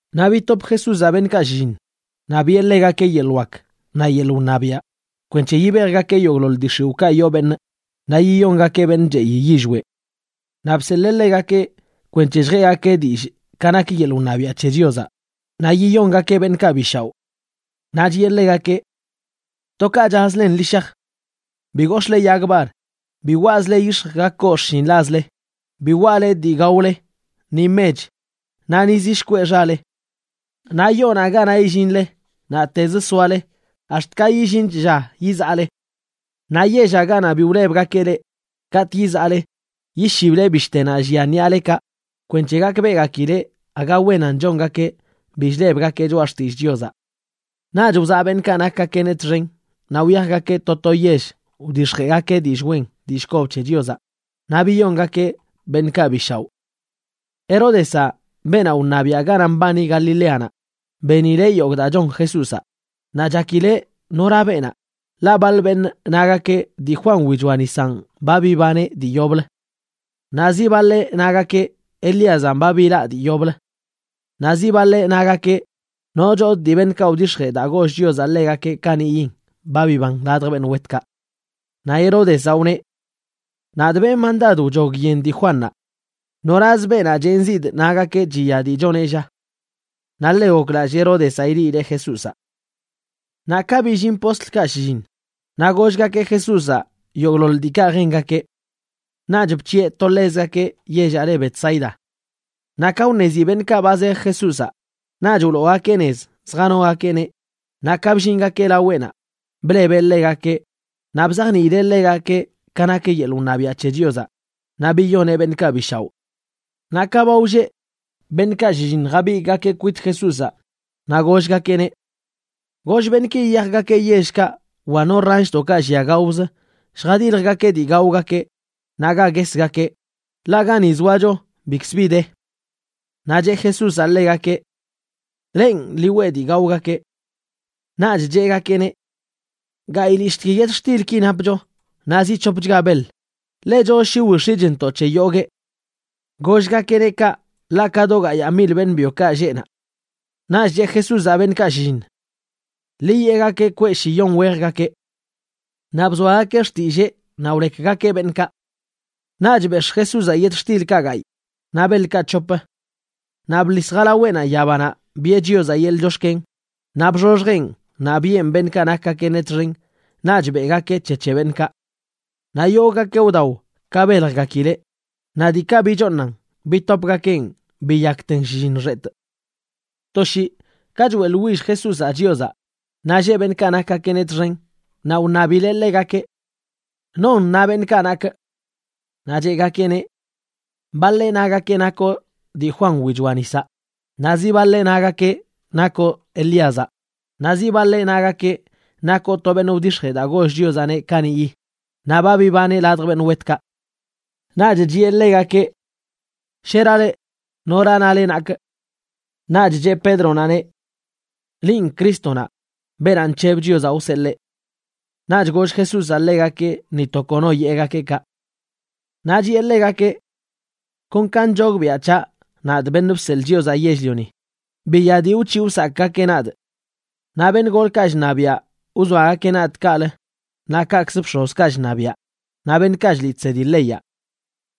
Naꞌ bitop Jesúzaꞌ beṉꞌkaꞌ shlliṉ, naꞌ biꞌe ḻegakeꞌ yeḻꞌ wak naꞌ yeḻꞌ wṉabiaꞌ kwenc̱he yibejgakeꞌ yogꞌḻoḻ dii x̱iwꞌkaꞌ yoo beṉꞌ naꞌ yiyongakeꞌ beṉꞌ cheꞌi yillweꞌ. Naꞌ bseḻee ḻegakeꞌ kwenc̱he lljeꞌgakeꞌ dillꞌ ka nak yeḻꞌ wṉabiaꞌ c̱he Chiozaꞌ, naꞌ yiyongakeꞌ beṉꞌkaꞌ bi shaoꞌ. Naꞌ chiꞌe ḻegakeꞌ: ―To ka chazlen ḻi shaj. Bi gox̱ꞌle yag bar, bi waꞌzle yix̱j ga koo xshinḻazle, bi waꞌle dii gaole, ni mech, naꞌ ni zi shkweꞌ xale. Naꞌ yoonaꞌ ganaꞌ illinle, naꞌtezə soale ax̱t ka illinch lla yizaꞌle. Naꞌ yellaꞌ ganaꞌ bi wlebgakeꞌ leꞌ, katꞌ yizaꞌle, yishible bishtenaꞌ llia ṉiꞌalekaꞌ kwenc̱he gakbeꞌgakileꞌ aga wenan chongakeꞌ bi chlebgakeꞌ choꞌa xtillꞌ Chiozaꞌ. Naꞌch wzaꞌ beṉꞌkaꞌ nakgakeꞌneꞌ txen naꞌ wyajgakeꞌ to to yell wdix̱jeꞌgakeꞌ dillꞌ wen dillꞌ kob c̱he Chiozaꞌ naꞌ biyongakeꞌ beṉꞌkaꞌ bi shaoꞌ. Heródezaꞌ, beenaꞌ wṉabiaꞌ ganaꞌ mbani Galileanaꞌ, benileꞌ yogꞌ daa chon Jesúzaꞌ. Naꞌ chakileꞌ nora beenaꞌ, ḻaꞌ baḻ beṉꞌ nagakeꞌ dii Juan wichoa nisanꞌ ba bibaneꞌ dii yoblə. Naꞌ zi baḻeꞌ nagakeꞌ Elíazanꞌ ba bilaꞌ dii yoblə. Naꞌ zi baḻeꞌ nagakeꞌ nochodꞌ dii beṉꞌkaꞌ wdix̱jee daa goll Chiozaꞌ ḻegakeꞌ kaniꞌyin ba biban ladj beṉꞌ wetkaꞌ. Naꞌ Heródezaꞌ wneꞌ: ―Nadꞌ benꞌ mandad wchog yen dii Juannaꞌ. ¿Noraz beenaꞌ chenzidꞌ nagakeꞌ chiya dii choneꞌ, lla? Naꞌ ḻe goklallꞌ Heródezaꞌ ileꞌileꞌ Jesúzaꞌ. Naꞌ ka billin postlkaꞌ shlliṉ, naꞌ gollgakeꞌ Jesúzaꞌ yogꞌḻoḻ diikaꞌ jengakeꞌ. Naꞌch bc̱hiꞌe to ḻezgakeꞌ yellaꞌ le Betsaida. Naꞌ ka wṉezi beṉꞌkaꞌ ba zej Jesúzaꞌ, naꞌch wloogakeꞌ nez zjanogakeꞌneꞌ naꞌ ka bllingakeꞌ laweꞌnaꞌ, blebeꞌ ḻegakeꞌ naꞌ bzajniileꞌ ḻegakeꞌ ka nak yeḻꞌ wṉabiaꞌ c̱he Chiozaꞌ, naꞌ biyoneꞌ beṉꞌkaꞌ bi shaoꞌ. Naꞌ ka ba wlleꞌ, beṉꞌkaꞌ shlliṉ jabigꞌgakeꞌ kwit Jesúzaꞌ naꞌ gollgakeꞌneꞌ: ―Goll beṉꞌki yiyajgakeꞌ yellkaꞌ wa no ranshdoꞌkaꞌ llia gaozə lljadiljgakeꞌ dii gaogakeꞌ naꞌ ga guesgakeꞌ, ḻaꞌ ga ni zoacho bikzə bi de. Naꞌ cheꞌ Jesúzaꞌ ḻegakeꞌ: ―Lenꞌ, ḻi weꞌ dii gaogakeꞌ. Naꞌch cheꞌgakeꞌneꞌ: ―Gayꞌlishꞌtgui yetxtilki napcho naꞌ zi c̱hopchga beḻ, ḻechozə shi willjx̱iꞌchntoꞌ c̱he yoguee. Gollgakeꞌneꞌ kaꞌ ḻaꞌ ka do gayaa mil beṉꞌ byokaꞌ lleꞌ naꞌ. Naꞌch cheꞌ Jesúzaꞌ beṉꞌkaꞌ shlliṉ: ―Ḻi yeꞌgakeꞌ kweꞌ shiyon wejgakeꞌ. Naꞌ bzoagakeꞌ xtillee naꞌ wlekgakeꞌ beṉꞌkaꞌ. Naꞌch bex̱ꞌ Jesúzaꞌ yetxtilkaꞌ gayꞌ naꞌ beḻkaꞌ c̱hop. Naꞌ bḻis jalaweꞌnaꞌ yabanaꞌ biꞌe Chiozaꞌ yeḻꞌ chox̱ken, naꞌ bxoxjeꞌn naꞌ biꞌen beṉꞌkaꞌ nakgakeꞌneꞌ txen naꞌch beꞌgakeꞌ c̱he c̱he beṉꞌkaꞌ. Naꞌ yogꞌgakeꞌ wdao ka beljgakileꞌ, naꞌ diikaꞌ bichooṉan bitopgakeꞌn biyakten shlliṉ xetꞌ. To shii ka choeꞌḻwill Jesúzaꞌ Chiozaꞌ, naꞌ lleꞌ beṉꞌkaꞌ nakgakeꞌneꞌ txen, naꞌ wṉabileꞌ ḻegakeꞌ: ―¿Non na beṉꞌkaꞌ nakꞌ? Naꞌ cheꞌgakeꞌneꞌ: ―Baḻeꞌ nagakeꞌ nakoꞌ dii Juan wichoa nisaꞌ, naꞌ zi baḻeꞌ nagakeꞌ nakoꞌ Elíazaꞌ, naꞌ zi baḻeꞌ nagakeꞌ nakoꞌ to beṉꞌ wdix̱jee daa goll Chiozaꞌneꞌ kaniꞌyi, naꞌ ba bibaneꞌ ladj beṉꞌ wetkaꞌ. Naꞌch chiꞌe ḻegakeꞌ: ―Shera leꞌ, ¿nora nale nakꞌ? Naꞌch cheꞌ Pédronaꞌneꞌ: ―Linꞌ Crístonaꞌ, beenaꞌ nc̱heb Chiozaꞌ wseḻee. Naꞌch goll Jesúzaꞌ ḻegakeꞌ ni to kono yeꞌgakeꞌ kaꞌ. Naꞌ chiꞌe ḻegakeꞌ: ―Kon ka nchogbiaꞌ c̱haꞌ, nadꞌ, Beṉꞌ Bseḻꞌ Chiozaꞌ Yell-lioni, biya dii wc̱hiꞌ wsakꞌgakeꞌ nadꞌ. Naꞌ beṉꞌ golkaꞌ chṉabiaꞌ wzoagakeꞌ nadꞌ kaꞌlə naꞌ kaꞌkzə bx̱ozkaꞌ chṉabiaꞌ naꞌ beṉꞌkaꞌ chliꞌ chsedi leyaꞌ.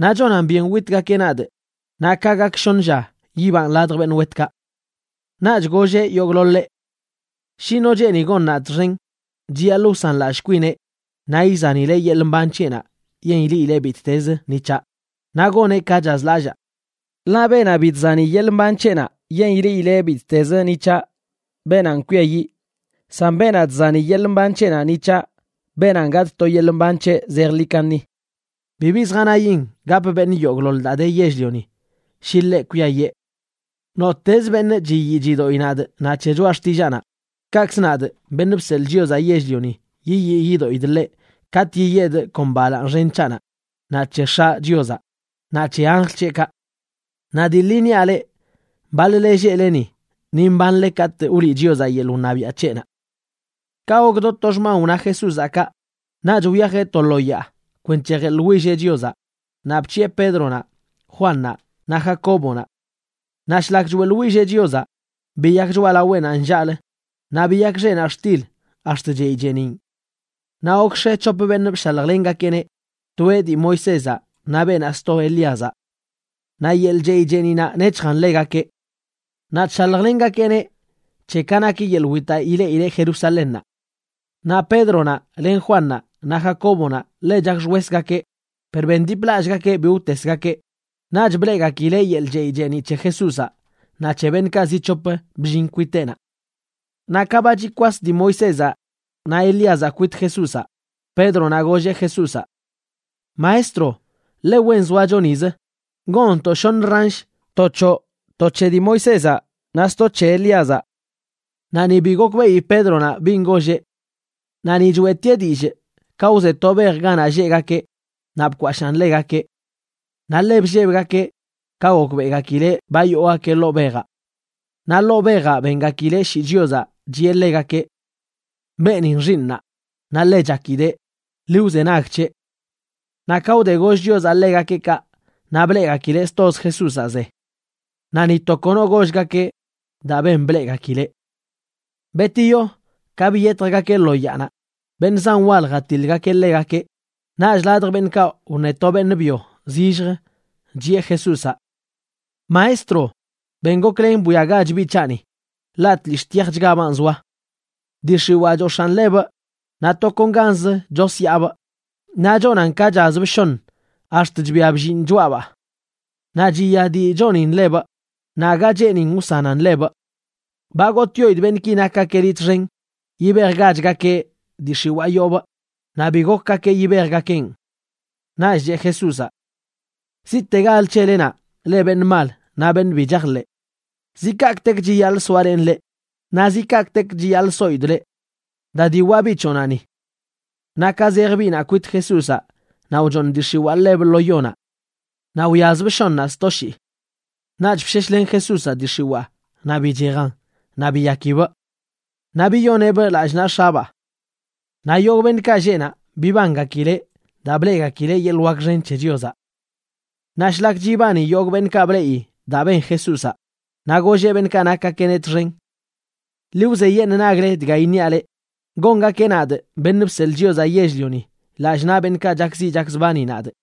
Naꞌ chonan byen witgakeꞌ nadꞌ, naꞌ ka gak shoṉ lla yibanꞌ ladj beṉꞌ wetkaꞌ. Naꞌch golleꞌ yogꞌḻoḻeꞌ: ―Shi no cheeni gon nadꞌ txen, chiyaḻꞌ wsanlallꞌ kwineꞌ naꞌ izanileꞌ yeḻꞌ mban c̱heꞌnaꞌ yen ileꞌileꞌ bittez ni c̱haꞌ, naꞌ goneꞌ ka chazlallaa. Ḻaꞌ beenaꞌ bi chzani yeḻꞌ mban c̱heꞌnaꞌ yen ileꞌileꞌ bittez ni c̱haꞌ, beenanꞌ kwiayiꞌ. San beenaꞌ chzani yeḻꞌ mban c̱heꞌnaꞌ ni c̱haꞌ, beenanꞌ gatꞌ to yeḻꞌ mban c̱heꞌ zejḻi kaṉi. Bibi zjanayin gap beṉꞌ yogꞌḻoḻ daa de yell-lioni, shi ḻeꞌ kwiayee. Nottezə beṉꞌ chiyii chidoꞌi nadꞌ naꞌ c̱he choꞌa xtillaanaꞌ, kaꞌkz nadꞌ, Beṉꞌ Bseḻꞌ Chiozaꞌ Yell-lioni, yiyii yidoꞌidꞌ ḻeꞌ katꞌ yiyedꞌ kon balaaṉ xen c̱haꞌnaꞌ, naꞌ c̱he X̱aꞌ Chiozaꞌ naꞌ c̱he anjl c̱heꞌkaꞌ. Naꞌ dii ḻi niaꞌ leꞌ, baḻ-le lleꞌle ni, ni mbanle katꞌ wliꞌ Chiozaꞌ yeḻꞌ wṉabiaꞌ c̱heꞌnaꞌ. Ka gok do to xman wna Jesúzaꞌ kaꞌ, naꞌch wyajeꞌ to lo yaa kwenc̱he jeḻwilleꞌ Chiozaꞌ naꞌ bc̱hiꞌe Pédronaꞌ, Juannaꞌ naꞌ Jacóbonaꞌ. Naꞌ shlak choeꞌḻwilleꞌ Chiozaꞌ, biyak choꞌalaweꞌnaꞌ nllaꞌlə, naꞌ biyak xeꞌnaꞌ xtil ax̱t chey cheeniꞌn. Naꞌ gokx̱e c̱hop beṉꞌ bshaljlengakeꞌneꞌ, toeꞌ dii Moisézaꞌ naꞌ beenaꞌ sto Elíazaꞌ. Naꞌ yeḻꞌ chey cheeniꞌnaꞌ nec̱hjan ḻegakeꞌ. Naꞌ chshaljlengakeꞌneꞌ c̱he ka nak yeḻꞌ witaꞌ ileꞌileꞌ Jerusalénnaꞌ. Naꞌ Pédronaꞌ len Juannaꞌ naꞌ Jacóbonaꞌ ḻe chakxwesgakeꞌ, per bendiplallꞌgakeꞌ bi wtesgakeꞌ, naꞌch bleꞌgakileꞌ yeḻꞌ chey cheeniꞌ c̱he Jesúzaꞌ naꞌ c̱he beṉꞌkaꞌ zi c̱hop bllin kwiteꞌnaꞌ. Naꞌ ka ba chikwas dii Moisézaꞌ naꞌ Elíazaꞌ kwit Jesúzaꞌ, Pédronaꞌ golleꞌ Jesúzaꞌ: ―Maestro, ¡ḻe wen zoacho nizə! Gonntoꞌ shoṉə ransh, to c̱hoꞌ, to c̱he dii Moisézaꞌ naꞌ sto c̱he Elíazaꞌ. Naꞌ ni bi gokbeꞌi Pédronaꞌ bin golleꞌ. Naꞌ ni choeꞌtieꞌ dillꞌ, ka wze to bej ganaꞌ lleꞌgakeꞌ naꞌ bkwashaan ḻegakeꞌ. Naꞌ ḻe bllebgakeꞌ ka gokbeꞌgakileꞌ ba yoogakeꞌ ḻoo bejaꞌ. Naꞌ ḻoo bejaꞌ bengakileꞌ shii Chiozaꞌ, chiꞌe ḻegakeꞌ: ―Beenin xiiṉaa, naꞌ ḻe chakidee. Ḻi wzenag c̱heꞌ. Naꞌ ka wde goll Chiozaꞌ ḻegakeꞌ kaꞌ, naꞌ bleꞌgakileꞌ stozə Jesúzaꞌ ze. Naꞌ ni to kono gollgakeꞌ daa ben bleꞌgakileꞌ. Betiyo, ka biyetjgakeꞌ lo yaanaꞌ, beṉꞌ zan wal jatiḻgakeꞌ ḻegakeꞌ. Naꞌch ladj beṉꞌkaꞌ wṉe to beṉꞌ byo zillj, chiꞌe Jesúzaꞌ: ―Maestro, ben goklen bwiagach biꞌ c̱haꞌni, ḻaꞌ tlishꞌ tyajchgabaan zoa. Dii x̱iwaa chox̱aꞌn ḻebꞌ naꞌ tokonganz chosyaabꞌ, naꞌ chonan ka chazbꞌ shoṉ ax̱t chbia bllinꞌ choꞌabaa. Naꞌ chiya dii chonin ḻebꞌ, naꞌ aga cheenin wsanan ḻebꞌ. Ba gotꞌyoidꞌ beṉꞌki nakgakeꞌ liꞌ txen yibejgachgakeꞌ dii x̱iwaa yoobꞌ, naꞌ bi gokgakeꞌ yibejgakeꞌn. Naꞌch cheꞌ Jesúzaꞌ: ―¡Ziꞌtegalə c̱helenaꞌ, leꞌ beṉꞌ mal naꞌ beṉꞌ bi chajḻeꞌ! ¿Zi kaꞌkꞌtek chiyaḻꞌ soalenꞌ leꞌ? Naꞌ ¿zi kaꞌkꞌtek chiyaḻꞌ soidꞌ leꞌ? Da diwaꞌ biꞌ c̱hoꞌnaꞌ ni. Naꞌ ka zej biꞌnaꞌ kwit Jesúzaꞌ naꞌ wchooṉ dii x̱iwaa ḻebꞌ lo yonaꞌ naꞌ wyazbꞌ shoṉaꞌ sto shii. Naꞌch bsheshlen Jesúzaꞌ dii x̱iwaa naꞌ bichejan, naꞌ biyakibꞌ. Naꞌ biyoneꞌbꞌ lallꞌ naꞌ x̱abaa. Naꞌ yogꞌ beṉꞌkaꞌ lleꞌ naꞌ bibangakileꞌ daa bleꞌgakileꞌ yeḻꞌ wak xen c̱he Chiozaꞌ. Sto shii wdix̱jee Jesúzaꞌ witgakeꞌneꞌ Naꞌ shlak chibani yogꞌ beṉꞌkaꞌ bleꞌi daa ben Jesúzaꞌ, naꞌ golleꞌ beṉꞌkaꞌ nakgakeꞌneꞌ txen: ―Ḻi wzeyeṉꞌ nagle dga iṉiaꞌ leꞌ: gongakeꞌ nadꞌ, Beṉꞌ Bseḻꞌ Chiozaꞌ Yell-lioni, lallꞌ naꞌ beṉꞌkaꞌ chakziꞌ chakzbani nadꞌ.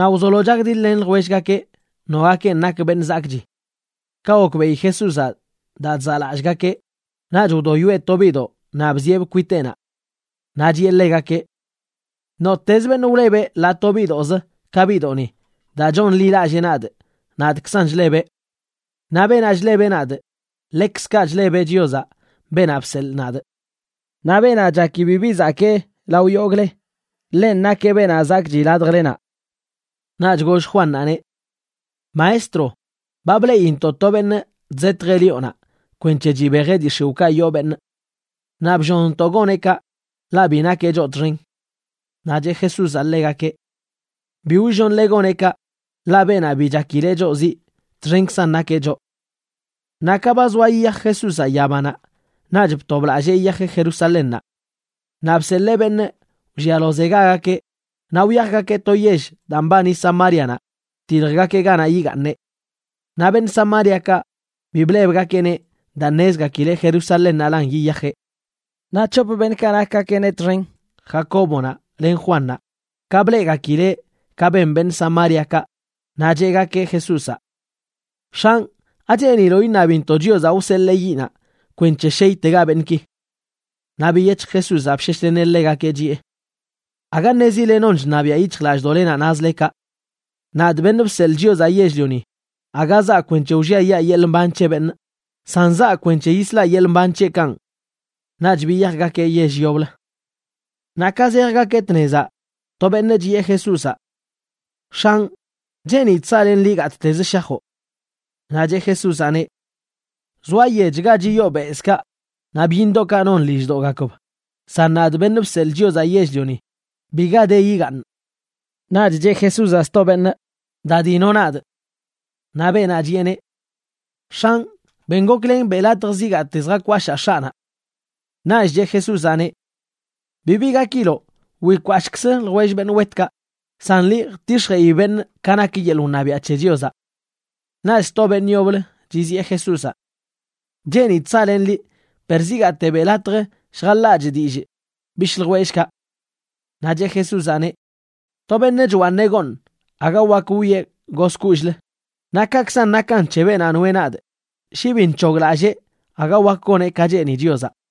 Naꞌ wzolo chakdiḻ-len ljwellgakeꞌ nogakenꞌ nak beṉꞌ zakꞌchi. Ka gokbeꞌi Jesúzaꞌ daa chzaꞌlallꞌgakeꞌ, naꞌch wdoyoeꞌ to biꞌdoꞌ naꞌ bzieꞌbꞌ kwiteꞌnaꞌ. Naꞌ chiꞌe ḻegakeꞌ: ―Nottezə beṉꞌ wlebeꞌ ḻaa to biꞌdoꞌzə ka biꞌdoꞌni daa chonḻilallee nadꞌ, nadꞌkzan chlebeꞌ. Naꞌ beenaꞌ chlebeꞌ nadꞌ, ḻekzkaꞌ chlebeꞌ Chiozaꞌ, beenaꞌ bseḻꞌ nadꞌ. Naꞌ beenaꞌ chaki bibi zakee lao yogꞌle, ḻenꞌ nakeꞌ beṉꞌ zakꞌchi ladjlenaꞌ. Naꞌch goll Juannaꞌneꞌ: ―Maestro, ba bleꞌintoꞌ to beṉꞌ chzetjeꞌ lioꞌnaꞌ kwenc̱he chibejeꞌ dii x̱iwꞌkaꞌ yoo beṉꞌ. Naꞌ bllonntoꞌ goneꞌ kaꞌ, ḻaꞌ bi nakeꞌ choꞌ txen. Naꞌ cheꞌ Jesúzaꞌ ḻegakeꞌ: ―Bi wllonle goneꞌ kaꞌ, ḻaꞌ beenaꞌ bi chakileꞌ choꞌ ziꞌ, txenkzan nakeꞌ choꞌ. Naꞌ ka ba zoa yiyaj Jesúzaꞌ yabanaꞌ, naꞌch btoblallee yiyajeꞌ Jerusalénnaꞌ. Naꞌ bseḻee beṉꞌ wllialozegagakeꞌ naꞌ wyajgakeꞌ to yell daa mbani Samárianaꞌ jtiljgakeꞌ ganaꞌ yigaaṉeꞌ. Naꞌ beṉꞌ Samáriakaꞌ bi blebgakeꞌneꞌ daa ṉezgakileꞌ Jerusalénnaꞌlan yiyajeꞌ. Naꞌ c̱hop beṉꞌkaꞌ nakgakeꞌneꞌ txen, Jacóbonaꞌ len Juannaꞌ, ka bleꞌgakileꞌ ka ben beṉꞌ Samáriakaꞌ, naꞌ cheꞌgakeꞌ Jesúzaꞌ: ―X̱anꞌ, ¿acheeniloꞌ iṉabintoꞌ Chiozaꞌ wseḻee yiꞌnaꞌ kwenc̱he sheytega beṉꞌki? Naꞌ biyec̱hj Jesúzaꞌ bsheshleneꞌ ḻegakeꞌ, chiꞌe: ―Aga ṉezile non chṉabiaꞌ yic̱hjlallꞌdoꞌlenaꞌ nazle kaꞌ. Nadꞌ, Beṉꞌ Bseḻꞌ Chiozaꞌ Yell-lioni, aga zaa kwenc̱he wlliayaa yeḻꞌ mban c̱he beṉꞌ, san zaa kwenc̱he yislaꞌ yeḻꞌ mban c̱heꞌkanꞌ. Naꞌch biyajgakeꞌ yell yoblə. Naꞌ ka zejgakeꞌ tnezaꞌ, to beṉꞌ chiꞌe Jesúzaꞌ: ―X̱anꞌ, cheenidꞌ saꞌlenꞌ liꞌ gattezə shajoꞌ. Naꞌ cheꞌ Jesúzaꞌneꞌ: ―Zoa yech ga chiyoo bezꞌkaꞌ, naꞌ byiṉdoꞌkaꞌ non lilldoꞌgakb, san nadꞌ, Beṉꞌ Bseḻꞌ Chiozaꞌ Yell-lioni, biga de yigaaṉꞌ. Naꞌch cheꞌ Jesúzaꞌ sto beṉꞌ: ―Da dino nadꞌ. Naꞌ beenaꞌ chiꞌeneꞌ: ―X̱anꞌ, ben goklen beꞌ latj zigaate lljakwashaa x̱aꞌnaꞌ. Naꞌch cheꞌ Jesúzaꞌneꞌ: ―Bibi gakiloꞌ, wikwashꞌkzə ljwell beṉꞌ wetkaꞌ. San liꞌ, jtix̱jeꞌi beṉꞌ ka nak yeḻꞌ wṉabiaꞌ c̱he Chiozaꞌ. Naꞌch sto beṉꞌ yoblə chiziꞌe Jesúzaꞌ: ―X̱anꞌ, cheenidꞌ saꞌlenꞌ liꞌ per zigaate beꞌ latj lljaḻaachꞌ dillꞌ bishꞌ ljwellꞌkaꞌ. Naꞌ cheꞌ Jesúzaꞌneꞌ: ―To beṉꞌ chwaaṉeꞌ gooṉ, aga wak wwieꞌ gozkollꞌlə. Naꞌ kaꞌkzan nakan c̱he beenaꞌ noeꞌ nadꞌ, shi bi nc̱hoglallee aga wak goneꞌ ka cheeni Chiozaꞌ.